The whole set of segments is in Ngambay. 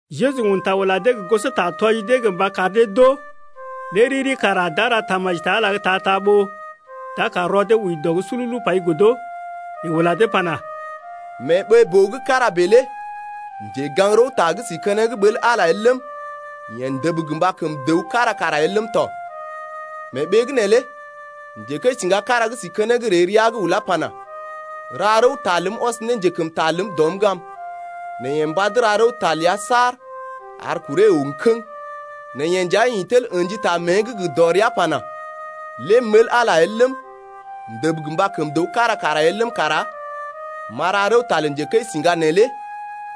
Jeju un ta ula dee gə gosota tɔji dee gə mba kar dee d’oo, lé riri kara d’a ra tamaji ta Ala’g ta-ta ɓó d’a kar rɔ dee wəi dɔ’g sululu pai godo. Yeḛ ula dee pana: Mee ɓee-boo gə́ kára bèe lé njegaŋ-rəwta gə́ si keneŋ ɓəl Ala el ləm, yeḛ ndəb gə mba kəm dəw kára kara el ləm tɔ. Mee ɓee’g neelé njekəisiŋga kára gə́ si keneŋ ree rəa’g ulá pana: Ra rəwta ləm ɔs ne njekəmta ləm dɔm’g am. Nɛ yeḛ mbad ra rəwta ləa saar ar kuree əw kəŋ. Nɛ yeḛ nja ḭ tel ə̰ji ta mée’g gə dɔrea pana: Lée m’ɓəl Ala el ləm, m’ndəb gə mba kəm dəw kára kara el ləm kara m’a ra rəwta lə njekəisiŋga neelé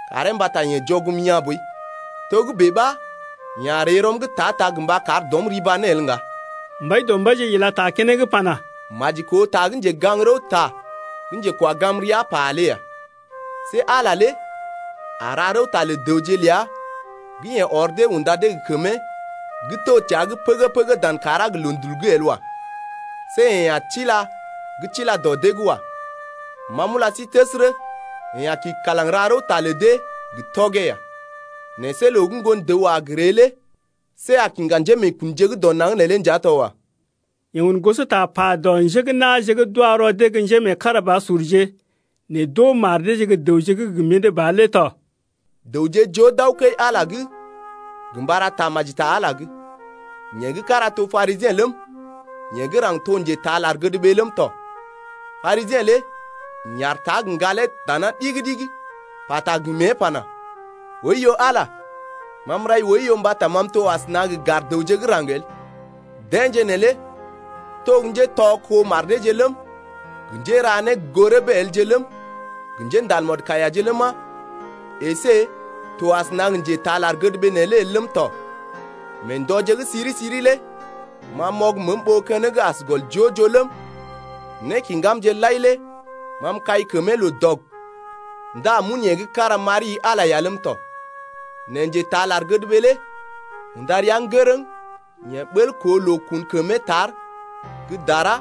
karee mbata yeḛ jɔgm yaa̰ boi, togə́bè ɓa yeḛ a ree rɔm’g ta-ta gə mba kar dɔm riba ne el ŋga. Mbaidɔmbaije ila ta keneŋ pana: Maji koo ta gə́ njegaŋ-rəwta gə́ njekwa gam rəa pa lé ya. See Ala lé a ra rəwta lə dəwje ləa gə́ yeḛ ɔr dee unda dee gə kəmee gə́ to təa’g pəgə-pəgə dan kàrá gə loondul’g lé bel wa. See yeḛ a tila gə́ tila dɔ dee’g wa. Ma m’ula sí təsərə yeḛ a kḭ kalaŋ ra rəwta lə dee gə tɔgee ya. Nɛ see loo gə́ Ŋgon-dəw a gə ree lé see a kiŋga njémeekunje gə́ dɔ naŋg neelé nja to wa. Yeḛ un gosota pa dɔ njé gə́ na̰je gə́ d’wa rɔ dee gə́ njémeekarabasurje nɛ d’oo mar deeje gə́ dəwje gə́ gə mḭdé ba lé tɔ. Dəwje joo d’aw kəi-Ala’g gə mba ra tamaji ta Ala’g. Yeḛ gə́ kára to Parisiḛ ləm, yeḛ gə́ raŋg to njetaa lar-gədɓee ləm tɔ. Parisiḛ lé ḭ aar tar gə ŋgalee dana ɗigi-ɗigi, pata gə mée pana: Oiyo Ala, ma m’rai oiyo mbata ma m’to asəna gə gar dəwje gə́ raŋg el. Deḛje neelé to gə́ njétɔ kó mar deeje ləm, gə njéra né gə́ gə goo rəbee elje ləm, gə njéndal mɔdkaiyaje ləma, əsé m’to asəna gə njétaa lar-gədɓee neelé el ləm tɔ. Mee ndɔje gə́ siri-siri lé ma m’ɔg məəm ɓó keneŋ as gɔl joo-joo ləm, nékiŋgamje lai lé ma m’kai kəmee loo dɔg ndá m’un yee gə́ kára m’ari-i Ala lé ya ləm tɔ. Nɛ njetaa lar-gədɓee lé unda rəa ŋgərəŋ, yeḛ ɓəl koo loo kun kəmee tar gə́ dara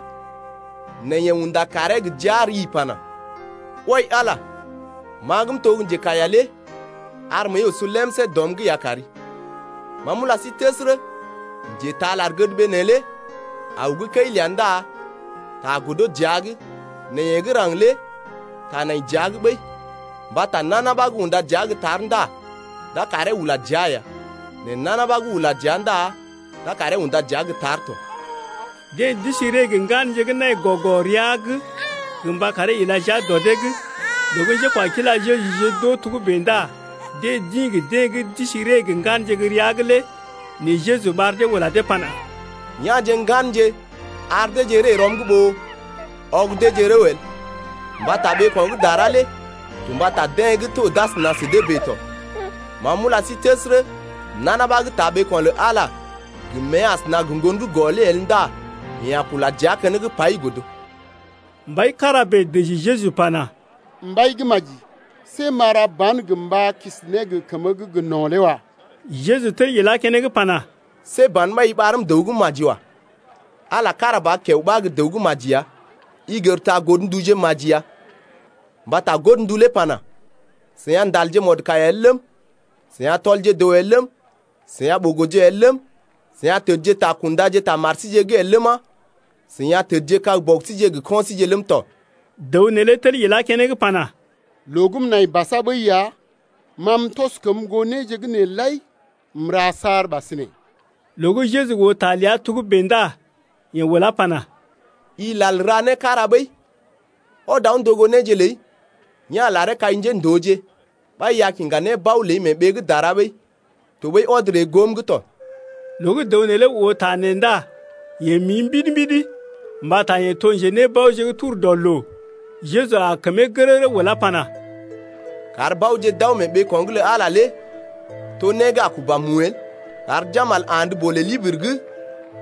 nɛ yeḛ unda kaaree gə jia rii pana: Wai Ala, ma gə́ m’to gə́ njekaiya lé ar məəi oso lemsé dɔm’g ya kari. Ma m’ula sí təsərə, njetaa lar-gədɓee neelé aw gə́ kəi ləa ndá ta godo dəa’g, nɛ yeḛ gə́ raŋg lé ta nai dəa’g ɓəi. Mbata nana ɓa gə́ unda dəa gə́ tar ndá d’a karee ula dəa ya, nɛ nana ɓa gə́ ula dəa ndá d’a karee unda dəa gə́ tar tɔ. Deḛ d’isi ree gə ŋganje gə́ nai gɔ-gɔ rəa’g gə mba karee ila jia dɔ dee’g. Loo gə́ njékwakila Jejuje d’oo togə́bè ndá deḛ d’ḭ gə deḛ gə́ d’isi ree gə ŋganje gə́ rəa’g lé. Nɛ Jeju ɓar dee ula dee pana: Ya̰je ŋganje ar deeje ree rɔm’g ɓó ɔg deeje rəw el. Mbata ɓeeko̰ gə́ dara lé to mbata deḛ gə́ to d’asəna sə dee bèe tɔ. Ma m’ula sí təsərə, nana ɓa gə́ taa ɓeeko̰ lə Ala lé gə mée asəna gə ŋgon gə́ gɔ lé el ndá yeḛ a kula dəa keneŋ pai godo. Mbai kára bèe dəji Jeju pana: Mbai gə́ maji, see m’a ra ba̰ gə mba si ne gə kəmə gə́ gə no̰ lé wa. Jeju tel ilá keneŋ pana: See ban ɓa i ɓarm dəw gə́ maji wa. Ala kára ba kiao ɓa gə́ dəw gə́ maji ya. I gər ta godnduje maji ya. Mbata godndu lé pana: I a ndal mɔdkaiya el ləm, i a tɔl dəw el ləm, i a ɓogoje el ləm, i a təd ta kundaje ta mari’g el ləma, i a tədjekag bɔbije gə kɔinje ləm tɔ. Dəw neelé tel ilá keneŋ pana: Loo gə́ m’nai basa ɓəi ya, ma m’tɔs kəm goo néje gə́ nee lai m’ra saar ɓasinè. Loo gə́ Jeju oo ta ləa togə́bè ndá yeḛ ulá pana: I lal ra né kára ɓəi. Ɔd aw ndogo néje ləi, ya̰ laree kai njéndooje, ɓa i a kiŋga nébao ləi lé mee ɓee gə́ dara ɓəi. Tɔɓəi ɔd ree goom’g tɔ. Loo gə́ dəw neelé oo ta nee ndá yeḛ mii mbidi, mbata yeḛ to njenébaoje gə́ tur dɔ loo. Jeju aa kəmee gərərə ulá pana: Kar baoje d’aw mee ɓeeko̰’g lə Ala lé to né gə́ a kuba mu el. Kar jambal andə kəmbolè libiri’g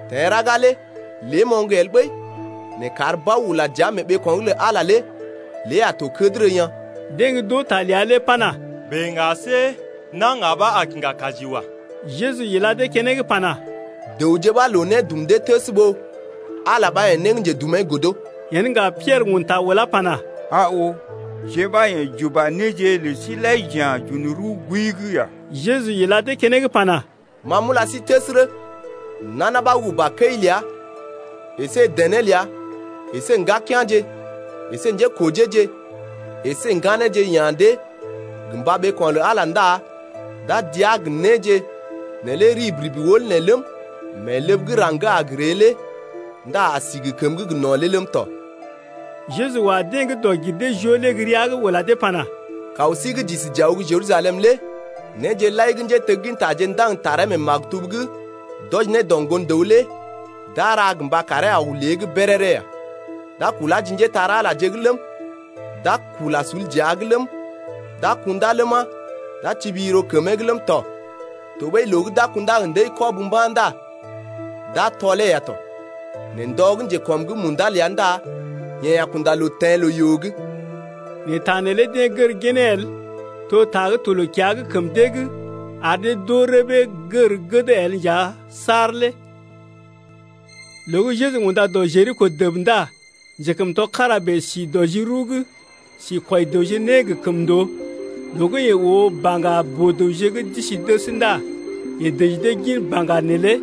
teḛ raga lé lée moŋg el ɓəi, nɛ kar bao ula dəa mee ɓeeko̰’g lə Ala lé lée a to kədərə yaa̰. Deḛ gə́ d’oo ta ləa lé pana: Bèe ŋga see na̰ ŋga ɓa a kiŋga kaji wa. Jeju ila dee keneŋ pana: Dəwje ɓa loo né dum dee təs ɓó Ala ɓa yḛ̀, né gə́ njedumee godo. Yen ŋga Piɛrə un ta ulá pana: Aa oo, jeḛ ɓa yḛ̀ j’uba néje lə sí lai j’ya̰ j’un rəw gooi’g ya. Jeju ila dee keneŋ pana: Ma m’ula sí təsərə, nana ɓa gə́ uba kəi ləa əsé dené ləa əsé ŋgakea̰je əsé njékojeeje əsé ŋganeeje ya̰ dee gə mba ɓeeko̰ lə Ala ndá d’a dəaa gə néje neelé rib-rib wəl nee ləm, mee ləb gə́ raŋg gə́ a ree lé ndá a si gə kəməgə́ gə no̰ lé ləm tɔ. Jeju wa deḛ gə́ dɔg-gir-dee-joo lé gə́ rəa’g ula dee pana: Kaw sí gə́ j’isi j’aw gə́ Jerusalem lé néje lai gə́ njéteggintaje ndaŋg taree mee maktub’g d’wɔji ne dɔ Ŋgon-dəw lé d’a ra gə mba karee aw lée’g béréré ya. D’a kulá ji njépole-magəje’g ləm, d’a kula sul dəa’g ləm, d’a kundá ləma, d’a tibi yiro kəmee’g ləm tɔ. Tɔɓəi loo gə́ d’a kundá gə ndəi-kɔb mba̰ ndá d’a tɔlee ya tɔ, nɛ ndɔ gə́ njekɔm’g munda ləa ndá yeḛ a kunda loo teḛ loo-yoo’g. Nɛ ta neelé deḛ gər ginee el. To ta gə́ to loo-kiya’g kəm dee’g ar dee d’oo rəbee gər gəd el nja saar lé. Loo gə́ Jeju unda dɔ Jeriko dəb ndá njekəmtɔ kára bèe si dɔ ji rəw’g si kwɔi dəwje né gə kəmndoo. Loo gə́ yeḛ oo baŋga boo-dəwje gə́ d’isi dəs ndá yeḛ dəji dee gin baŋga lə dee lé.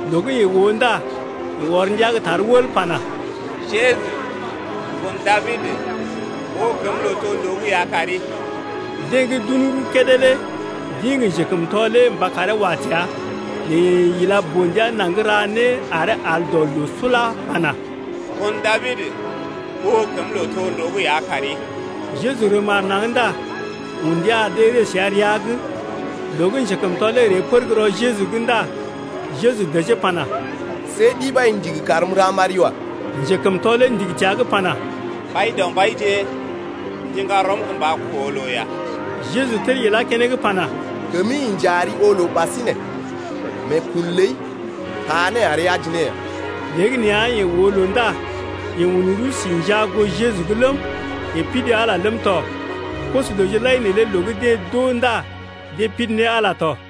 Loo gə́ yeḛ oo ndá yeḛ ɔr ndia gə́ tar wəl pana: Jeju, ŋgon Dabid, oo kəm lootondoo’g ya kari. Deḛ gə́ d’un rəw kédé lé d’ḭ gə njekəmtɔ lé mba karee wa təa, nɛ yeḛ ila boo-ndia naŋg ra né aree al dɔ loo sula pana: Ŋgon Dabid, oo kəm lootondoo’g ya kari. Jeju rəm aar naŋg ndá un ndia ar dee ree səa rəa’g. Loo gə́ njekəmtɔ lé ree pər gə́ rɔ Jeju’g ndá Jeju dəjee pana: See ɗi ɓa i ndigi karm m’ra m’ari wa. Njekəmtɔ lé ndigi təa’g pana: Mbaidɔmbaije, m’ndiŋga rɔm gə mba koo loo ya. Jeju tel ilá keneŋ pana: Kəmi inja ari oo loo ɓasinè, meekun ləi taa né ari aji ne ya. Léegəneeya yeḛ oo loo ndá yeḛ un rəw si njaa goo Jeju’g ləm, yeḛ pidi Ala ləm tɔ. Koso-dəwje lai neelé loo gə́ deḛ d’oo ndá deḛ pidi ne Ala tɔ.